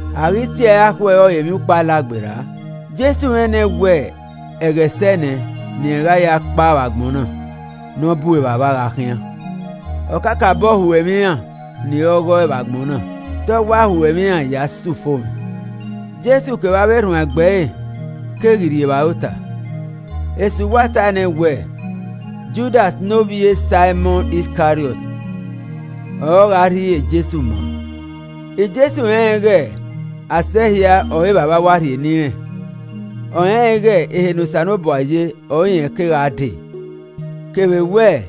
A ghi tie ẹre akhuẹ ọrọre Emwiukpo Alagberra, Jesu rẹn nẹ wẹ ẹghẹ sẹe nẹ ne irẹn gha ya kpao vbe agbọn na ne ọ bu Evbavba gha khian. Ọ kakabọ ho ẹmwẹ iran ni re ọghọe vbe agbọn na, te ọ wa ho ẹmwẹ iran ya sẹ ufomwẹ. Jesu kevbe avbe erhuanegbe ẹre keghi rri evbare ota. Esu wa tae nẹ wẹẹ Judas ne ovbi e Saimọn Iskariọt ọre ọ gha rhie Jesu ma. Jesu rẹnrẹn ighe asẹ hia ọre Evbavba wa rhie ne irẹn, ọ rẹnrẹn ighe ehe ne Osanobua ye ọre irẹn ke gha dee, kevbe wẹ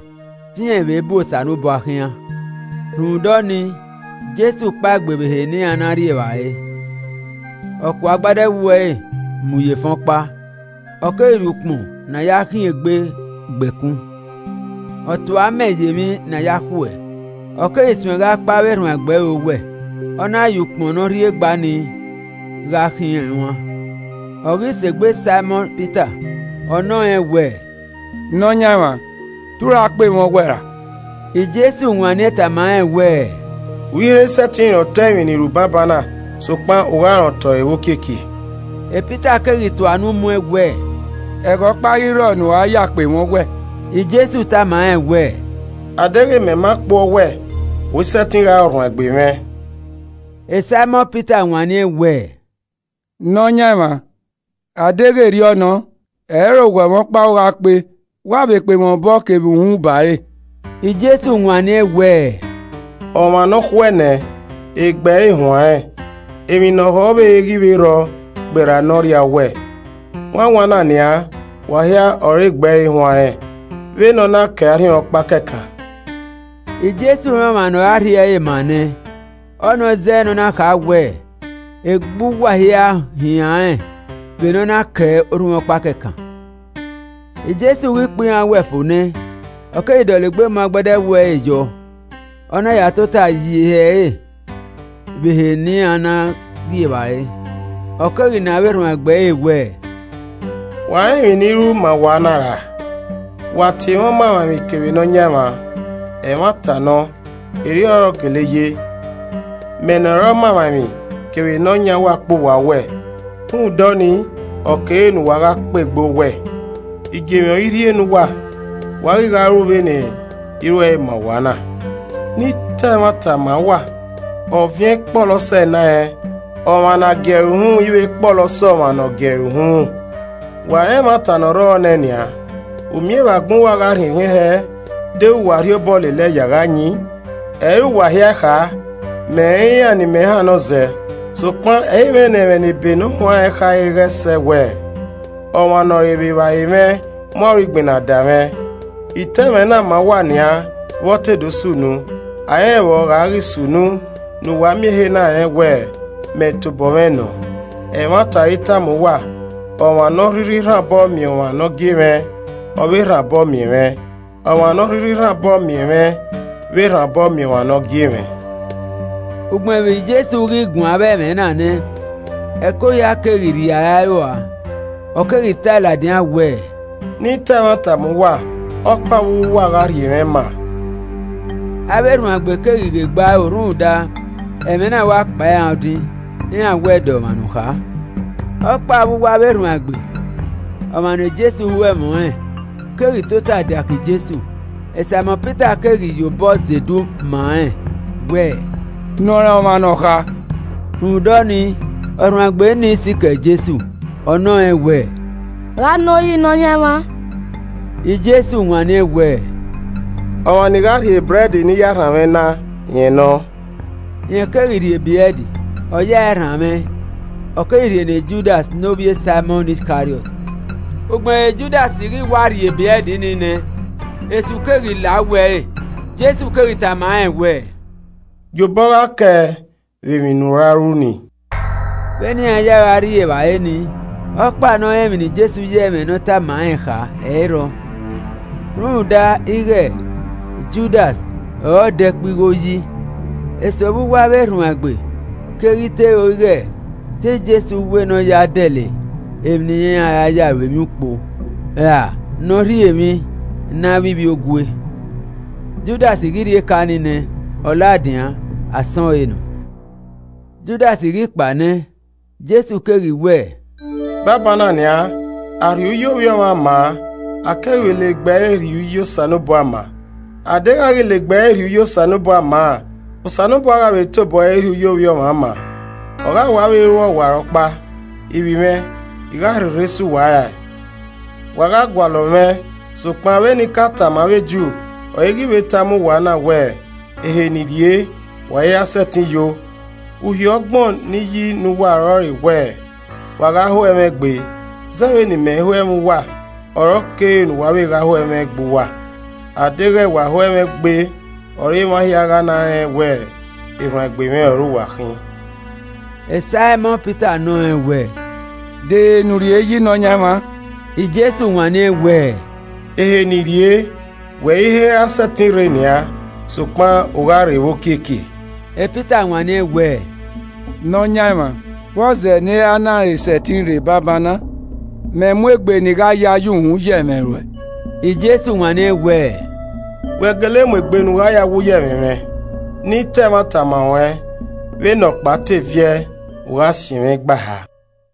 te irẹn vbe bu Osanobua khian. Rhunmwuda ọnii, Jesu kpaegbe vbe ehe ne iran na rri evbare, ọ kuọ agbada ẹwu ẹre mu ye efẹn ọkpa, ọ keghi rhie ukpọn ne a ya khiẹn egbe gba ẹkun. Ọ tue amẹ ye emwi ne a ya khuẹ, ọ keghi suẹn gha kpe avbe erhuanegbe ẹre owẹ, ọ na ya ukpọn ne ọ rhiegba ni gha khiẹn rẹn uan. Ọ ghi sẹ egbe Saimọn Pita, ọ nọ rẹn wẹ, “Nọyaẹnmwa, te u ra kpe mwẹ owẹ ra?” Jesu wanniẹn tama rẹn wẹẹ, “U i he sẹtin rẹn otọ emwi ne I ru banbanna, sokpan u gha rẹn otọ ẹre vbe okiekie.” Pita keghi tua unu mu ẹn wẹ, “Ẹghẹ ọkpa i rrọ ne u gha ya kpe mwẹ owẹ!” Jesu tama rẹn wẹ, “A deghẹ, mẹ ma kpuẹ owẹ, u i sẹtin gha re ọrhuanegbe mwẹ.” Saimọn Pita wanniẹn wẹẹ, “Nọyaẹnmwa, a deghẹ erriọ nọ, ẹ i re owẹ mwẹ ọkpa u gha kpe, wa vbe kpe mwẹ obọ kevbe uhunmwu ba re.” Jesu wanniẹn wẹẹ, “Ọmwa nọkhuẹ nẹ, egbe ẹre huanrẹn, emwi ne ọ ho ọvbehe i ghi vbe rrọọ gberra ne ọ rria owẹ. Wanwan na nian, wa hia ọre egbe ẹre huanrẹn, vbe ne ọ na kẹe arhiọnkpa kẹkan.” ( Jesu rẹn ọmwa ne ọ ra rhie ẹre ma an nẹ, ọnii ọ zẹẹ ne ọ na kha wẹẹ, “Egbe uwa hia huanrẹn vbe ne ọ na kẹe arhiọnkpa kẹkan.”) Jesu ghi kpe iran owẹ fo nẹ, ọ keghi dọlegbe mu agbada ẹwu ẹre yọ, ọ na ya tota ye ihe ẹre vbe ehe ne iran na rri evbare, ọ keghi nọ avbe erhuanegbe ẹre wẹẹ, “Wa rẹn emwi ne I ru ma uwa na ra? Wa tie mwẹ Ọmamwaemwi kevbe Nọyaẹnmwa, ẹmwata nọ, erriọ ọre ọ gele ye. Mẹ ne ọ re Ọmamwaemwi kevbe Nọyaẹn uwa kpe uwa owẹ. Rhunmwuda ọnii ọ kere ne uwa vbe gha kpe egbe owẹ. Igiemwi ọre I rhie ne uwa, wa ghi gha ru vbene I ruẹe ma uwa na. Ne I ta ẹmwata ma uwa. Ọviẹn i kpọlọ sẹ enarẹn, ọmwa ne a gie ẹre uhunmwu i vbe kpọlọ sẹ ọmwa ene ọ gie ẹre uhunmwu. Wa rẹn ẹmwata ne ọ rrọọ nẹ nian. U miẹn vbe agbọn uwa gha rhiẹnrhiẹn hẹ deghẹ wa rhie obọ lele ẹe ya gha yin. “Ẹ i re uwa hia I kha. Mẹ rẹn iran ne I mẹ hannọ zẹ. sokpan ẹ i mwẹ ne ẹmwẹ ne ebe ne ọ huanrẹn khare ghẹ sẹ wẹ, ‘Ọmwa ne ọ re vbe evbare mwẹ mu aro igbinna da mwẹ.’ I ta ẹmwẹ na ma uwa nian vbe ọ te do sunu, a i rẹn vbe ọ gha ghi sunu ne uwa miẹn ehe na rẹn wẹ, ‘Mẹ Tobọ Mwẹ Nọ.’ Ẹmwata ọre I tama uwa. Ọmwa ne ọ rhirhi rhan obọ miẹn ọmwa ne imẹ gie, ọ vbe rhan obọ miẹn mwẹ. Ọmwa ne ọ rhirhi rhan obọ miẹn mwẹ vbe rhan obọ miẹn ọmwa ne ọ gie mwẹ.” Ugbẹn vbe Jesu ghi guan avbe ẹmwẹ na nẹ, ẹko hia keghi rriara ẹe rua, ọ keghi tae ladian wẹẹ, “Ne I ta ẹmwata ma uwa, ọkpa vbe uwu uwa gha rhie mwẹ maa.” Avbe erhuanegbe keghi ghe egbe aro rhunmwuda, ẹmwẹ na wa kpan iran odin, iran wẹ de ọmwa ne ọ kha. Ọkpa vbe uwu avbe erhuanegbe, ọmwa ne Jesu ho ẹmwẹ ọnrẹn, keghi tota diake Jesu. Saimọn Pita keghi ye obọ zedu ma rẹn wẹ, “Nọ rẹn ọmwa ne ọ kha.” Rhunmwuda ọnii, ọrhuanegbe nii sikẹ Jesu, ọ nọ rẹn wẹẹ, “Gha nọ yi Nọyaẹnmwa?” Jesu wanniẹn wẹẹ, “Ọmwa ne I gha rhie ebrẹd ne I ya rhanmwẹ na, rẹn nọ.” Rẹn keghi rhie ebrẹd, ọ ya ẹe rhanmwẹ, ọ keghi rhie ne Judas ne ovbi e Saimọn Iskariọt. Ugbẹn vbe Judas ghi wa rhie ebrẹd nii nẹ, Esu keghi la uwu ẹre. Jesu keghi tama rẹn wẹẹ, “Gie obọ gha kẹe vbe emwi ne u ra ru ni.” Vbene iran ya gha rri evbare nii, ọkpa nọ rẹn emwi ne Jesu ya ẹmwẹ ne ọ tama rẹn kha ẹ i rrọọ. Rhunmwuda ighẹ Judas ọre ọ da ẹkpo igho yi, eso vbe uwu avbe erhuanegbe keghi te ro ighẹ te Jesu wẹ ne ọ ya dẹlẹ emwi ne iran ra ya ru emwi ukpo, ra nọ rhie emwi ne avbe ivbiogue. Judas ghi rhie eka nii nẹ, ọ ladian, Asọn ẹre nọ. Judas ghi kpao nẹ, Jesu keghi wẹẹ, “Banbanna nian, a rhie uyi Ovbi Ọmwa maa, a keghi vbe la egbe ẹre rhie uyi Osanobua maa. A deghẹ a ghi la egbe ẹre rhie uyi Osanobua maa, Osanobua gha vbe tobọ ẹre rhie uyi Ovbi Ọmwa maa, ọ gha wa vbe ruẹe ọwarọkpa. Ivbi mwẹ, I gha rherhe sẹ uwa rae. Wa gha gualọ mwẹ, sokpan vbene I ka tama avbe Ju ọre I ghi vbe tama uwa na wẹ, ‘Ehe ne I rrie, wa i ra sẹtin yo?’ Uhi ọgbọn ne I yi ne uwa ọrọre wẹ, wa gha ho ẹmwẹ egbe. Zẹ vbene I mẹ ho ẹmwẹ uwa ọre ọ kere ne uwa vbe gha ho ẹmwẹ egbe uwa. A deghẹ wa ho ẹmwẹ egbe ọre emwa hia gha na rẹn wẹ erhuanegbe mwẹ ọre uwa khin.” Saimọn Pita nọ rẹn wẹ, “De ehe ne u rrie yi Nọyaẹnmwa?” Jesu wanniẹn wẹẹ, “Ehe ne I rrie, wẹ i he ra sẹtin rre nian, sokpan u gha rre vbe okiekie.” Pita wanniẹn wẹ, “Nọyaẹnmwa, vbọzẹ ne I i ra na he sẹtin rre banbanna? Mẹ mu egbe ne I gha ya ye uhunmwu ye ẹmwẹ ruẹn!” Jesu wanniẹn wẹ, “Wẹ gele mu egbe ne u gha ya wu ye ẹmwẹ mwẹ? Ne I ta ẹmwata ma ruẹn, vbene ọkpa te viẹ, u gha siẹn mwẹ igba eha.